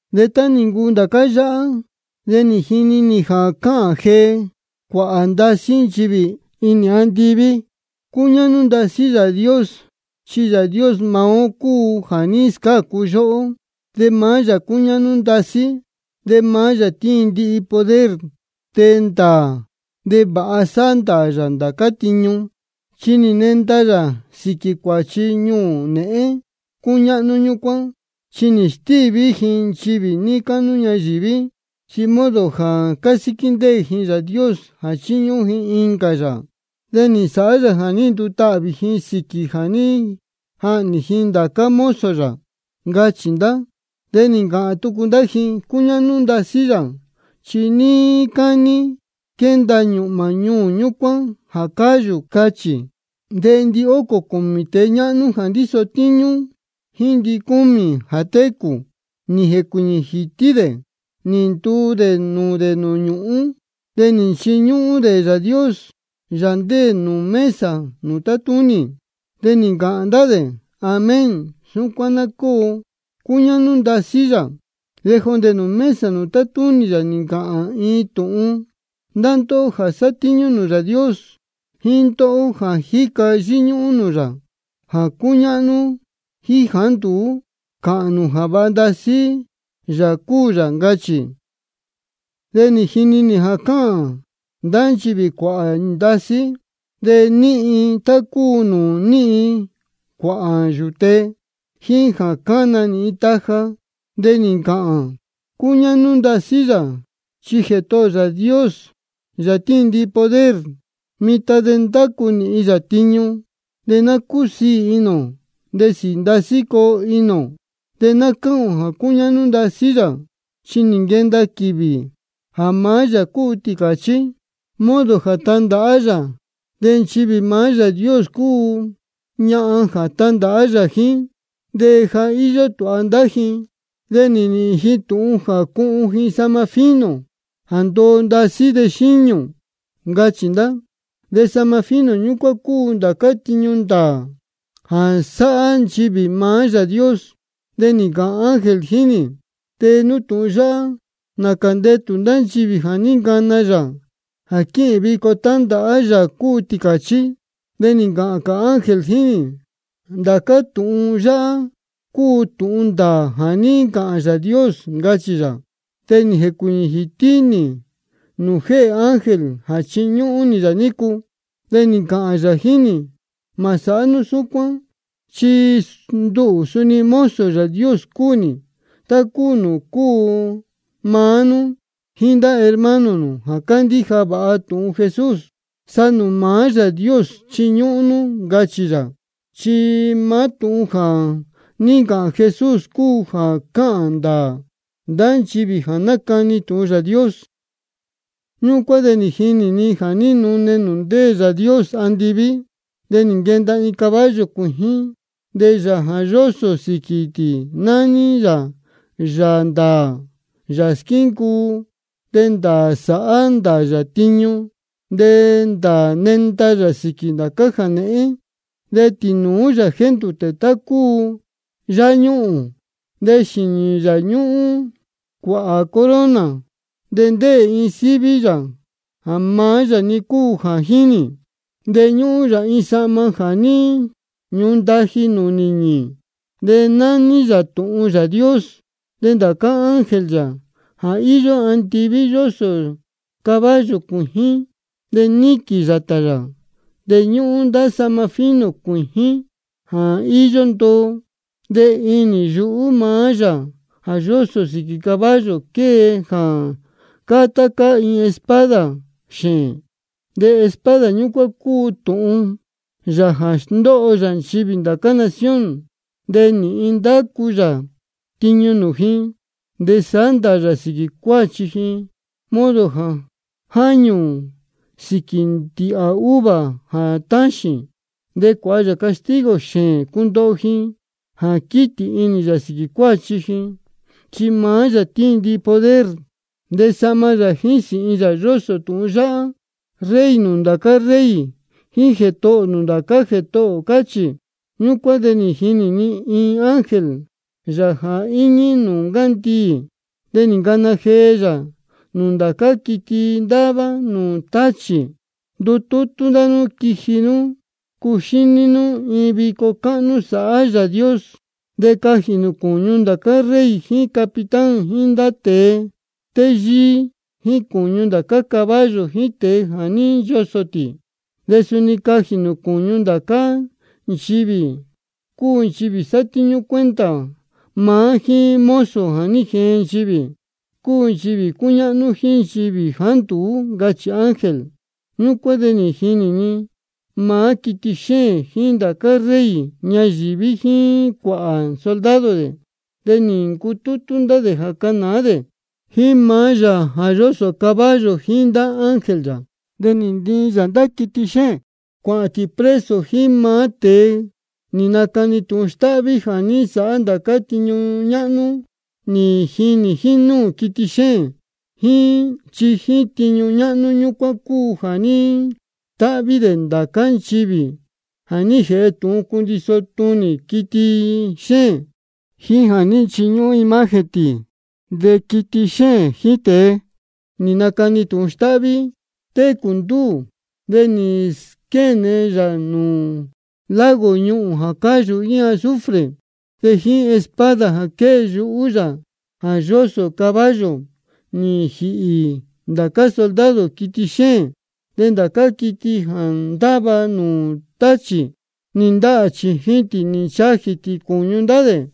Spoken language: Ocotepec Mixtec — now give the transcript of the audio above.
De tá nī ncuu ndācá yáhá, de nī jini nī jā cáhān jee cuāhā ndasí nchivī inī andiví: Cúñáhnú ndasí Yāā Dios. Chi Yāā Dios maá ó cúu jā ní scácu yóhó. De maá yā cúñáhnú ndasí, de maá yā tíin ndihi poder. De ndāā de vāha sáhá ndāā yā ndācá tiñu, chi nī nenda yā sīquī cuāchi ñuū nēhén cúñáhnú ñúcuán. Chi nī stíví ji nchivī níí cáhnú ñayīví, chi modo jā cásíquí ndéē ji Yāā Dios jā chíñúhún ji incā yāā. De nī nsāhá yā jā ní ndutahvī ji sīquī jā ní jahnī ji ndācá mozo yā. Ncachī ndá. De nī ncāhān tucu ndá ji: Cúñáhnú ndasí yā. Chi níí cání quenda ñūhmā ñuū ñúcuán jā cáyū, cáchī. De ndihócō cūmī tēe ñáhnú jā ndíso tíñú, jíín ndicúmī jā técū, nī jēcuīñī jītí dē nī ntuu dē nūū dē nūū ñūhún, de nī nchiñúhún dē Yāā Dios, Yāā ndéē nūū mesa nūū tátúnī. De nī ncāhān ndá dē: Amén. Súcuán ná cóo. Cúñáhnú ndasí yā. De jondē nūū mesa nūū tátúnī yā nī ncāhān iin tūhun: Ndá ndóhó jā sátíñú nūū Yāā Dios, jíín ndóhó jā jíca yíñúhún nūū yā, jā cúñáhnú jíín jāá nduú, cāhān nū jā vāha ndasí Yāā cúu yā. Ncachī. De nī jini nī jā cáhān ndá nchivī cuāhā ndasí, de níhin tá cúu nūū níhin cuāhā yūte, jíín jā cána nīhin taja. De nī ncāhān: Cúñáhnú ndasí yā. Chi Jētohō ō Yāā Dios, Yāā tíin ndihi poder, mitan de ndácu nīhin yā tiñu. De ná cúsiī inī ō, de sīī ndasí ná cóo inī ō, de ná cáhān ō jā cúñáhnú ndasí yā. Chi nī nquenda quīvī jā maá Yāā cúu Tīcāchí, modo jā tandāhá yā. De nchivī maá Yāā Dios cúu tá cúu ñahan jā tandāhá jíín yā, de ja íyó tūha ndá ji. De nī nīhīn ji tūhun jā cuhun ji sahma fino jā ndoo ndasí de xíñū. Ncachī ndá. De sahma fino ñúcuán cúu ndācá tiñu ndāā jā sáhá nchivī maá Yāā Dios. De nī ncāhān ángel jíín nī: Tee nú tūhun yáhá: Nācā ndetū ndá nchivī jā ní ncana yā jā quíhīn vico tándāhá Yāā cúu Tīcāchí. De nī ncāhān cā ángel jíín nī: Ndācá tūhun yáhá cúu tūhun ndāā jā ní ncāhān Yāā Dios, ncachī yā. De nī jēcuīñī jītí nī nūū jéhē ángel jā chiñúhún nī yā nícu. De nī ncāhān yā jíín nī: Mā sāhá nú súcuán. Chi nduhū suni mozo Yāā Dios cúu nī, tá cúu nūū cúu maá nú jíín ndá hermano nū jā cándíja vāha tūhun Jesús. Sa nūū maá Yāā Dios chiñúhún nú, ncachī yā. Chi maá tūhun jā ní ncāhān Jesús cúu jā cáhān ndāā ndá nchivī jā nácani tūhun Yāā Dios. Ñúcuán de nī jinī ni jā núne nūū ndéē Yāā Dios andiví. De nī nquenda iin caballo cuījín, de Yāā jā yósō sīquī tī nání yā Yāā ndāā, Yāā squíncuu. De ndāā sáhá ndāā yā tiñu, de ndāā nénda yā sīquī ndācá jānēhén. De tīnūú yā jéndūtē tá cúu yáñuhūn. De xīnī yā ñúhún cuāhā corona. De ndéē iin síví yā jā maá-ni yā cúu jā jínī. De ñúhún yā iin sahma jā ní ñundaji nūū nīñī, de nání yā Tūhun Yāā Dios. De ndācá ángel yā jā íyó andiví, yósō caballo cuījín de níquīn yātā yā. De ñúhún ndá sahma fino cuījín jā íyó ndoo. De inī yuhú maá Yāā jā yósō sīquī caballo, quée jā cáá tá cáá iin espada xēēn. De espada ñúcuán cúu tūhun yā jā sndóho yā nchivī ndācá nación. De nīhin ndacu yā tiñu nūū ji. De sāhá ndāā yā sīquī cuāchi ji modo jā jáñū sīquī ndīhā uva jā táxīn. De cuāha yā castigo xēēn cundoho ji jā quítī inī yā sīquī cuāchi ji. Chi maá yā tíin ndihi poder. De sahma yā jíín sīhin yā yósō tūhun yáhá: Rey nūū ndācá rey jíín Jētohō nūū ndācá jētohō, cáchī. Ñúcuán de nī jinī ni iin ángel yā jā íñí nūū ncandiī. De nī ncana jee yā nūū ndācá quiti ndáva nūū táchī: Ndutútú ndá nú quiji nú cuxíní nú iin vico cáhnú sāhá Yāā Dios. De cajī nū cūñu ndācá rey jíín capitán jíín ndá tēe téyíí, jíín cūñu ndācá caballo jíín tēe jā ní nchosō tī. De suni cajī nū cūñu ndācá cā nchivī, cúu nchivī sátíñú cuenta maá jíín mozo jā ní jeen nchivī, cúu nchivī cúñáhnú jíín nchivī jāá nduú, ncachī ángel. Ñúcuán de nī jinī ni maá quiti xéēn jíín ndācá rey ñayīví jíín cuāhā soldado dē. De nī ncutútú dē jā canāá dē jíín maá Yāā jā yósō caballo jíín ndá ángel yā. De nī ntiin ndá yā quiti xéēn cuāhān tī preso jíín maá tēe nī nacani tūhun stáhví jā ní nsāhá ndācá tiñu ñáhnú nī jinī jínúū quiti xéēn. Chi jíín tiñu ñáhnú ñúcuán cúu jā ní stáhví dē ndācá nchivī jā ní jēhe tūhun cundiso tunī quiti xéēn, jíín jā ní nchiñúhún imagen tī. De quiti xéēn jíín tēe nī nacani tūhun stáhví, técū ndúū, de nī squéne yā nūū lago ñuhūn jā cáyū jíín azufre. De jíín espada jā quée yuhú Yāā jā yósō caballo nī jīhī ndācá soldado quiti xéēn. De ndācá quiti jā ndáva nūū táchī nī ndahā chījin tī nī nchajī tī cūñu ndá dē.